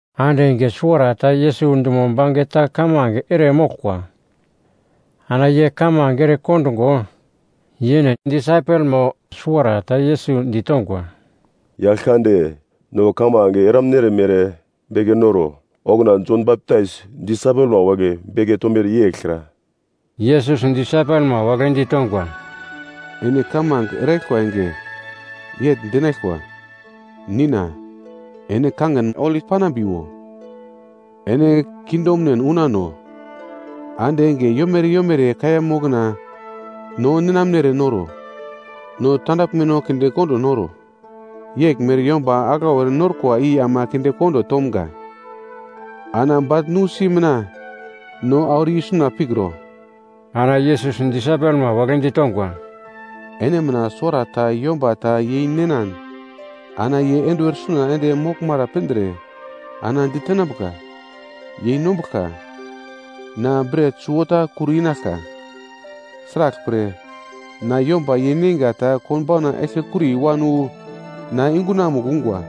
Ande enge suwarata Yesus dumo bangeta kamange ere moglkwa. Ana ye kamange ere kondungo, yene disaipelmo suwarata Yesus ditongwa, “Yaglkande, no kamange eramunere beke noro. Okuna Jon Baptais disaipelma wagle beke tomere yeglkra.” Yesus disaipelma wagle ditongwa, “Ene kamange eraglkwa enge, yegl dinaglkwa: “‘Nina, ene kangin holi panambiwo, ene kingdomnen unano. Ande enge yomere yomere kaiya mokna no ninamnere noro. No tandaglmeno kinde kondo noro, yeglmere yomba aglau erenorkwa i ama kinde kondo tomga. Ana bagl nusi mina no auro i suna pikro.’” Ana Yesus disaipelma wagle ditongwa, “Ene mina suwarata yomba ta yeininan ana ye enduwer suna ende moglmara pindre ana ditenambuka, ‘Yeinombuglka, na bret suwota kur inaglka. Sraglpre na yomba yeineinga ta konbauna eglkekuri wan wu na yungunamugl ungwa.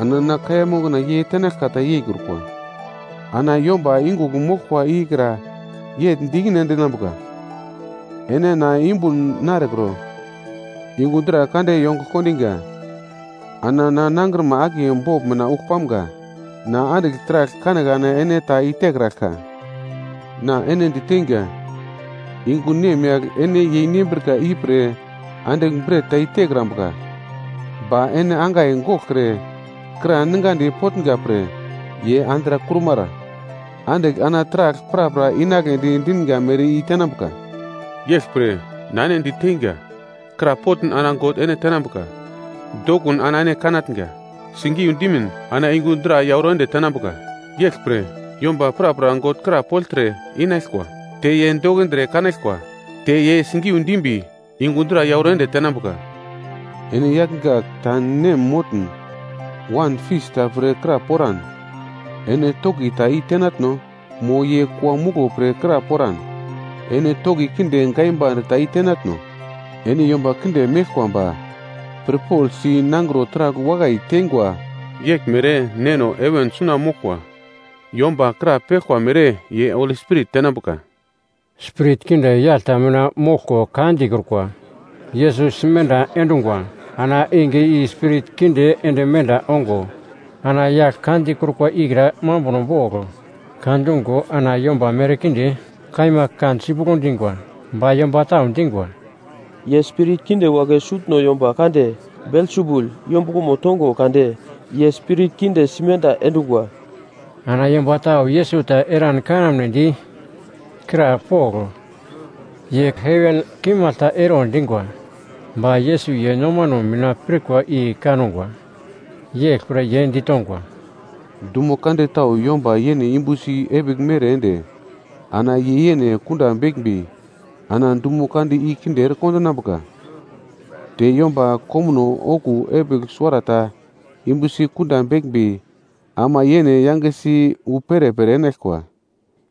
Ana na kaiya mokna ye tenaglka ta yeikrukwa.’ “Ana yomba yungugl moglkwa ikra yegl di ikine endinambuka, ‘Ene na yumbun narekro; yungu dra kande yongugl kondiga, ana na nangrima akiye bogl mina ugl pamga, na andigl taragl kanekane ene ta i tekraglka.’ Na ene diteinga, yungu nemyagl ene yeinembrika ipre andigl bret ta i tekrambuka. Ba ene angai goglkre kra ningadi potnga pre ye andrakrumara andigl ana taragl prapra inagledi dinga mere i-tenambuka. “Yeglpre na ene diteinga, krapotn ana God ene tenambuka, dokun ana ene kanatnga. Sigiu dimin ana yungu dra yauro ende tenambuka. Yeglpre yomba prapra God krapogltre, inaglkwa; te ye dokindre kanaglkwa. Te ye sigiu dimbi, yungu dra yauro ende tenambuka. “Ene yagl gak ta nem motn, wan fis ta pre kra poran, ene toki ta i-tenatno? Mo ye kua muglo pre kra poran, ene toki kinde gaimbande ta i tenatno? Ene yomba kinde meglkwa ba pirpogl si, nangro taragl wakai teingwa. Yeglmere Neno heven suna moglkwa, yomba krapeglkwa mere ye Holi Spirit tenambuka.” Spirit kinde yagl ta mina moglko ka dikrukwa, Yesus simenda endungwa. Ana enge i spirit kinde ende menda ongo ana yagl ka dikrukwa ikra mambuno bogl ka dungo ana yomba merkinde kaima kan sipuglo dingwa. Ba yomba tau dingwa, “Ye spirit kinde wagle sutno yomba kande Belsebul yombuglomo tongo kade ye spirit kinde simenda endungwa.” Ana yomba tau Yesus ta eran kanamnedi krapogl, ye heven kimagl ta ero dingwa. Ba Yesus ye nomano mina pirkwa i kangwa, yeglpre ye ditongwa, “Dumo kande tau yomba yene yumbusi epigl mere ende ana ye yene kunda beglmbi ana dumo kande i kinde ere kondinambuka. Te yomba komuno okuwo epigl suwarata yumbusi kunda beglmbi ama yene yangesi wu perepere enaglkwa.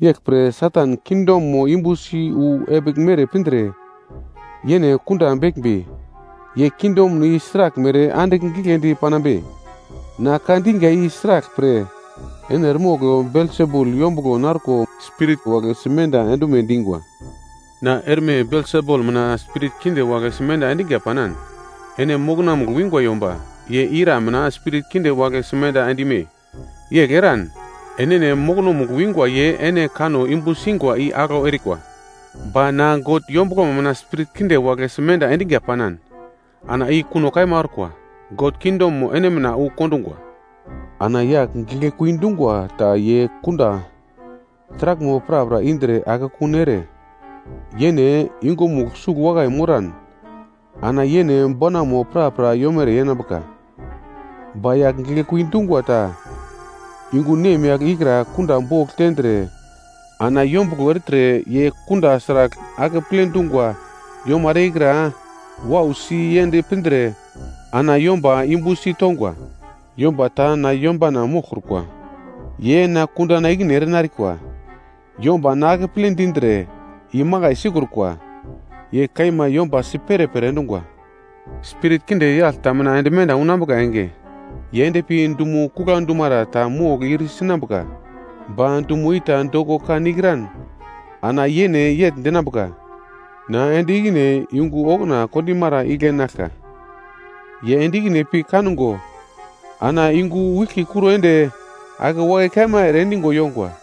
Yeglpre, Satan kingdomo yumbusi wu epigl mere pindre yene kunda beglmbi, ye kingdom i sraglmere andigl giglendi panambe? Na ka diga i sraglpre ene eremogl Belsebul yombuglo narko spirit wagle simenda endume dingwa. Na erme Belsebul mina spirit kinde wagle simenda endiga panan, ene mokonomugl wingwa yomba ye ira mina spirit kinde wagle simenda end-ime? Yegl eran enene mokonomugl wingwa ye ene kanno yumbu singwa i aglau erikwa. Ba na God yombuglomo mina spirit kinde wagle simenda endiga panan ana i kuno kaima orkwa, God kingdomo ene mina wu kondungwa. “Ana yagl giglekui dungwa ta ye kunda taraglmo prapra indre akekun ere, yene yungumugl sugl wakai moran, ana yene bonamo prapra yomere yenambuka. Ba yagl giglekui dungwa ta yungu nemyagl ikra kunda bogl tendre ana yombuglo ertre ye kunda sragl akeple dungwa yomara ikra wausi yend pindre ana yomba yumbusi tongwa. “Yomba ta na yombana moglkrukwa, ye na kundana ikine erenarikwa. Yomba na akeple dindre imakai sikrukwa, ye kaima yomba si perepere endungwa. “Spirit kinde yagl ta mina ende menda unambuka enge, ye endpi dumo kugla dumara ta mogl ir sinambuka ba dumo i ta doko kan ikran ana yene yegl dinambuka, ‘Na ende ikine yungu okuna kondimara igle enaglka.’ Ye ende ikine pi kango ana yungu wiglki kuro ende ake wakai kaima ere endigo yongwa.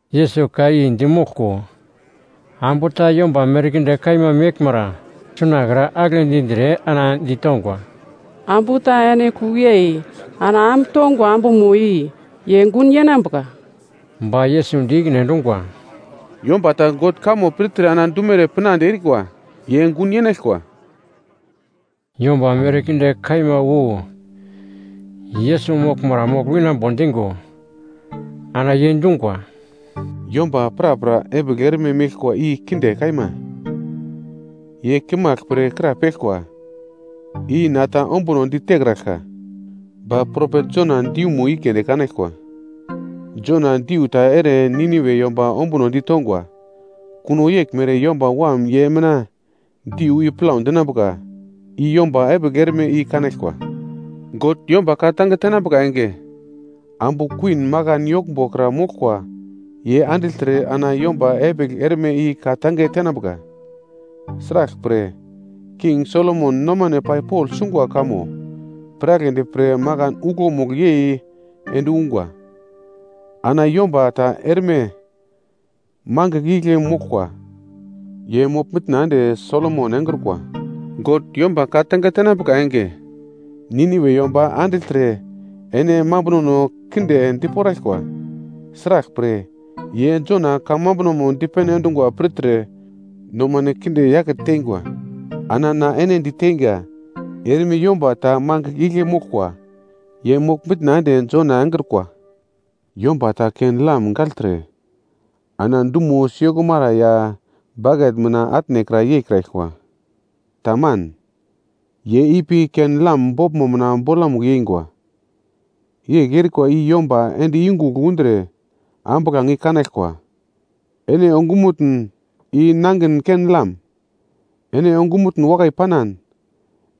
Yesus ka i di moglko, ambu ta yomba merkinde kaima meglmara suna kra agle dindre ana ditongwa, “Ambu ta ene kugl yei ana am tongwa ambumo i ye gun yenambuka.” Ba Yesus di ikine endungwa, “Yomba ta God kamo pirtre ana dumere pinande erikwa, ye gun yenaglkwa.” Yomba merkinde kaima wu Yesus moglmara mogl winambo dingo, ana ye dungwa, “Yomba prapra epigl erme meglkwa i kinde kaima! Ye kimagl pre krapeglkwa. I na ta ombuno di tekraglka. Ba propet Jona diumo i keunde kanaglkwa. Jona diu ta ere Niniwe yomba ombuno ditongwa, kuno yeglmere Yomba Wam ye mina diu i plau dinambuka i yomba epigl erme i kanaglkwa. God yomba ka-tange tenambuka enge, Ambu Kuwin Makan Yoglmbo kra moglkwa ye andigltre ana yomba epigl erme i ka-tange tenambuka. Sraglpre King Solomon nomane pai pogl sungwa kamo piragledi pre makan uglomugl yei ende ungwa. Ana yomba ta erme mangigl igle moglkwa, ye mogl-mitna ende Solomon engrukwa. God yomba ka-tange tenambuka enge, Niniwe yomba andigltre ene mambunono kinde diporaglkwa. Sraglpre ye Jona kamambuno dipene endungo pirtre nomano kinde yake teingwa. Ana na ene diteinga, erme yomba ta mangigl igle moglkwa ye mogl-mitna ende Jona engrukwa. “Yomba ta ken-lam gagltre, ana dumo siyokumara ya baket mina atnekra yeikraglkwa. Taman, ye ipi ken-lam boglmo mina bolamugl yeingwa. Yegl erikwa i yomba ende yungugl undre ambuglange i kanaglkwa. Ene ongumutn i nangin ken-lam. Ene ongumutn wakai panan,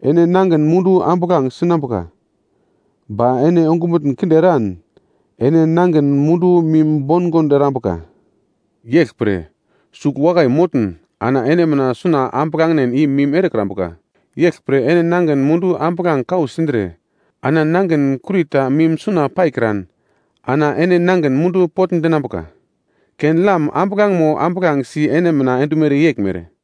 ene nangin mundu ambuglange sinambuka. Ba ene ongumutn kinde eran, ene nangin mundu mim bongond erambuka. Yeglpre, sugl wakai motn ana ene mina suna ambuglangen i mim erekrambuka. Yeglpre ene nangin mundu ambuglange kau sindre ana nangin kurita mim suna paikran ana ene nangin mundu potndinambuka, ken-lam ambuglangemo ambuglangesi ene mina endumere yeglmere.”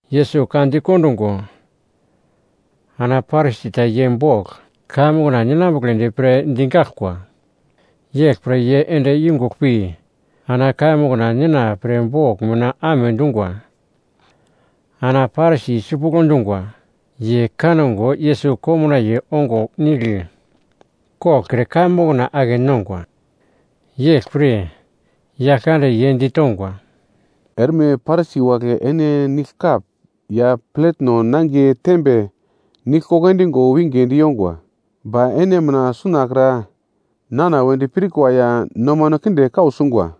Yesus ka dikondungo, ana Parisi ta ye bogl kaiya mokna ninambugledi pre digaglkwa, yeglpre ye ende yungugl pi ana kaiya mokna nena pre bogl mina amedungwa. Ana Parisi sipuglo dungwa, ye kango Yesus komnaiye ongo nigl koglkre kaiya mokna ake nongwa. Yeglpre, Yaglkande ye ditongwa, “Erme Parisi wagle ene nigl kap ya pletno nangiye tembe nigl endigo winge di yongwa, ba ene mina sunakra nana wedi pirkwa ya nomano kinde kau sungwa.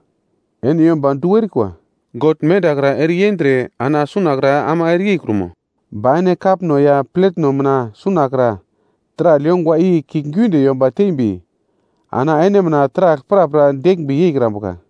Ene yomba du erikwa, God mendakra ere yendre ana sunakra ama ere yeikrumo? Ba ene kapno ya pletno mina sunakra taragl yongwa i kiuglgiunde yomba tembi ana ene mina taragl prapra deglmbi yeikrambuka.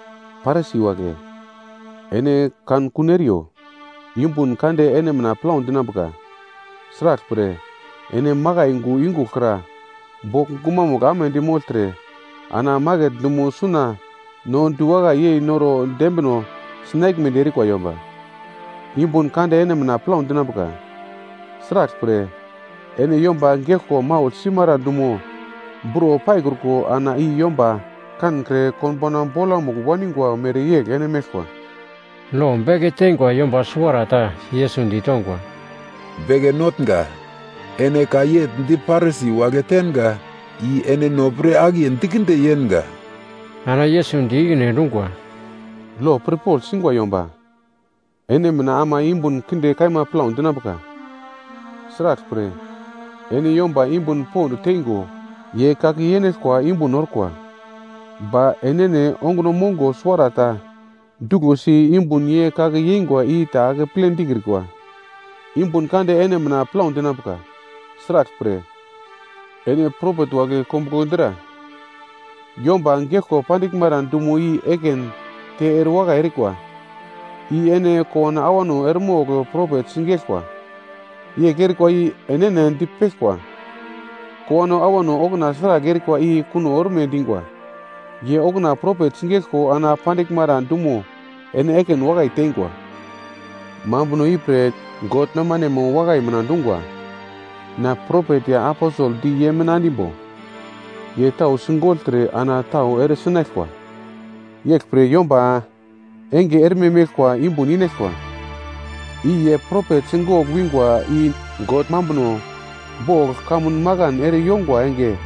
“Parisi wagle ene kankun eriyo, yumbun kande ene mina plau dinambuka. Sraglpre ene makai yungu yungugl kra bogl gumamugl amedi mogltre ana maket dumo suna no diwakai yei noro dembino sinaglmedi erikwa yomba. “Yumbun kande ene mina plau dinambuka. Sraglpre ene yomba geglko maugl simara dumo buro paikruko ana i yomba kankre konbauna bolamugl waningwa mereyegl ene meglkwa.” Lo beke teingwa yomba suwarata, Yesus ditongwa, “Beke Notnga, ene ka yegl di Parisi wagle tenga, i ene no pre akiye dikinde yenga.” Ana Yesus di ikine endungwa, “Lo pirpogl singwa yomba ene mina ama yumbun kinde kaima plau dinambuka. Sraglpre ene yomba yumbun pond teingo ye kake yenaglkwa yumbun orkwa. Ba enene onguno mongo suwarata ta duglosi yumbun ye kake yeingwa i ta akeple dikrikwa. “Yumbun kande ene mina plau dinambuka, sraglpre ene propet wagle kombuglo dra yomba geglko pandiglmara dumo i ekin te erewakai erikwa. I ene kowano awano eremogl propet sigeglkwa. Yegl erikwa i enene dipeglkwa, kowano awano okuna sragl erikwa i kuno orme dingwa. Ye okuna propet sigeglko ana pandiglmara dumo ene ekin wakai teingwa. Mambuno ipre God nomanemo wakai mina dungwa, ‘Na propet ya aposel di ye mina endimbo, ye tau sigogltre ana tau eresi tenaglkwa.’ Yeglpre yomba enge erme meglkwa yumbun inaglkwa, i ye propet sigogl wingwa i God mambuno bogl kamun makan ere yongwa enge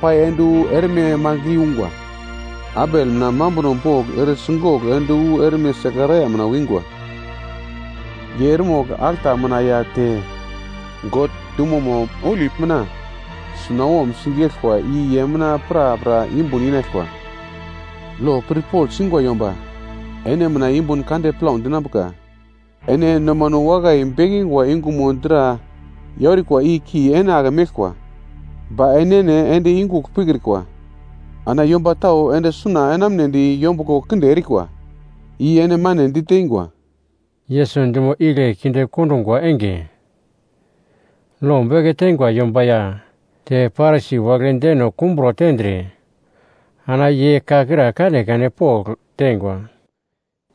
pai ende wu erme mangigl i ungwa. Abel mina mambuno bogl ere sigogl ende wu erme Sekaraia mina wingwa. Ye eremogl alta mina ya te God dumomo holi mina sunawom sigeglkwa i ye mina prapra yumbun inaglkwa. “Lo pirpogl singwa yomba ene mina yumbun kande plau dinambuka. Ene nomano wakai bekingwa yungumo dra yaurikwa i ki ene ake meglkwa, ba enene ende yungugl pikrikwa. Ana yomba tau ende suna enamunedi yombuglo kinde erikwa, i ene mane diteingwa.” Yesus dumo igle kinde kondungwa enge, lo beke teingwa yomba ya te Parisi wagle deno kumbro tendre ana ye ka kra kanekane pogl teingwa.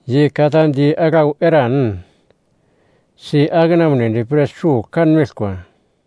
Ye ka ta di aglau eran si-ake enamunedi pre sugl kanmeglkwa.